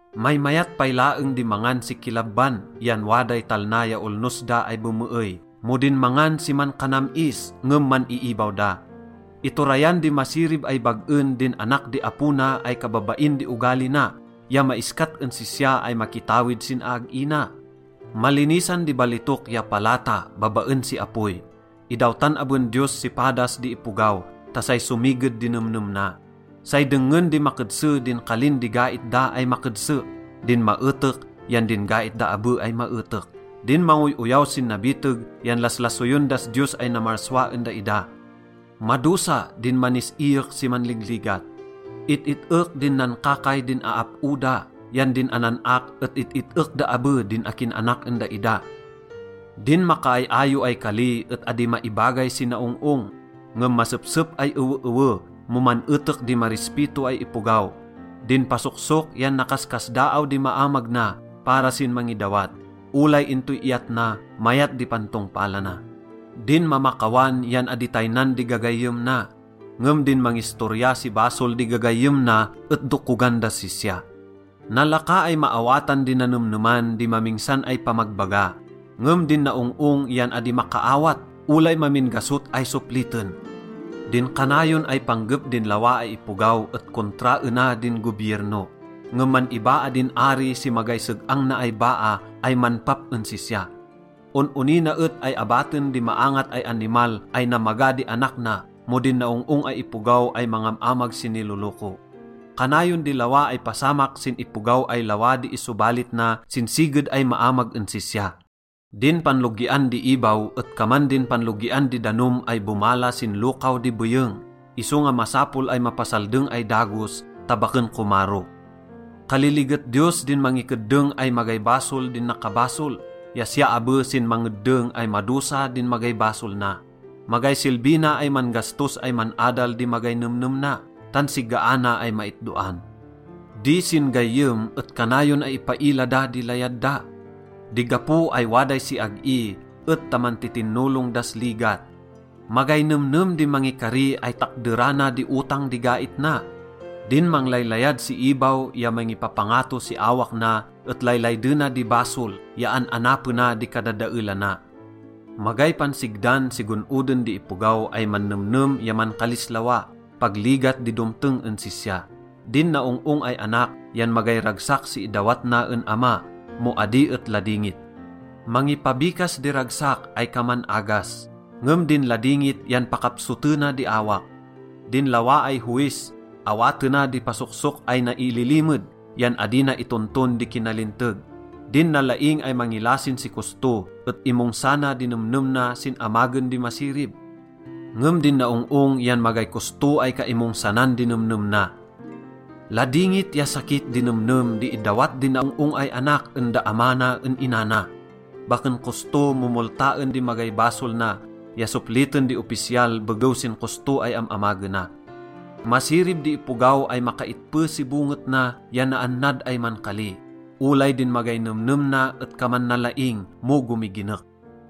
Maymayat pay laeng di mangan si kilabban yan waday talna ya olnos da ay bemeey mo din mangan si mankanam-is ngem man-iibaw da. Iturayan di masirib ay bag-en din anak di apo na ay kababain di ogali na ya maiskat en sisya ay makitawid sin aag-i na. Malinisan di balitok ya palata babaen si apoy. Idawtan aben Diyos si padas di ipogaw ta say somiged di nemnem na. Say dengngen di makedse din kalin di gait da ay makedse, din maetek yan din gait da abe ay maetek. Din mangoy-oyaw sin nabiteg yan laslasoyen das Diyos ay namarsua en daida. Madosa din manis-iyek si manligligat. It-it-ek din nankakay din aap-o da yan din anan-ak et it-it-ek da abe din akin anak en daida. Din makaay-ayo ay kali et adi maibagay si naong-ong; ngem masepsep ay eweewe mo man-etek di marispito ay ipogaw. Din pasoksok yan nakaskasdaaw di maamag na para sin mangidawat. Olay intoy iyat na, mayat di pantongpalana. Din mamakawan yan adi taynan di gagayyem na, ngem din mangistorya si basol di gagayyem na et dokogan das sisya. Nalaka ay maawatan di nanemneman di mamingsan ay pamagbaga, ngem din naong-ong yan adi makaawat olay mamin gasot ay sopliten. Din kanayon ay panggep din lawa ay ipogaw et kontraena din gobierno, ngem man-ibaa din ari si magay seg-ang na ay baa ay manpap en sisya. On-onina et ay abaten di maangat ay animal ay namaga di anak na mo din naong-ong ay ipogaw ay mangam-amag si niloloko. Kanayon di lawa ay pasamak sin ipogaw ay lawa di isobalit na sin siged ay maamag en sisya. Din panlogian di ibaw et kaman din panlogian di danom ay bomala sin lokaw di beyeng, isonga masapol ay mapasaldeng ay dagos ta baken komaro. Kaliliget Diyos din mangikeddeng ay magay basol din nakabasol ya siya abe sin mangeddeng ay madosa din magay basol na. Magay silbi na ay man-gastos ay man-adal di magay nemnem na, tan sigaana ay maitdoan. Di sin-gayyem et kanayon ay ipaila da di layad da. Di gapo ay waday siag-i et ta mantitinolong das ligat. Magay nemnem di mangikari ay takderana di otang di gait na. Din manglaylayad si ibaw ya mangipapangato si awak na et laylaydena di basol ya an-anapena di kadadaelana. Magay pansigdan si gon-oden di ipogaw ay mannemnem ya mankalis lawa. Pag ligat di domteng en sisya. Din naong-ong ay anak yan magay ragsak si idawat na en ama mo adi et ladingit. Mangipabikas di ragsak ay kaman agas, ngem din ladingit yan pakapsotena di awak. Din lawa ay howis, awatena di pasoksok ay naililimed yan adi na itonton di kinalinteg. Din nalaing ay mangilasin si kosto et imongsana di nemnem na sin amagen di masirib, ngem din naong-ong yan magay kosto ay kaimongsanan di nemnem na. Ladingit ya sakit di nemnem di idawat di naong-ong ay anak en da ama na en ina na. Baken kosto mo moltaen di magay basol na ya sopliten di opisyal begew sin kosto ay am-amagena. Masirib di ipogaw ay makaitpe si bonget na ya naannad ay mankali. Olay din magay nemnem na et kaman nalaing mo gomiginek.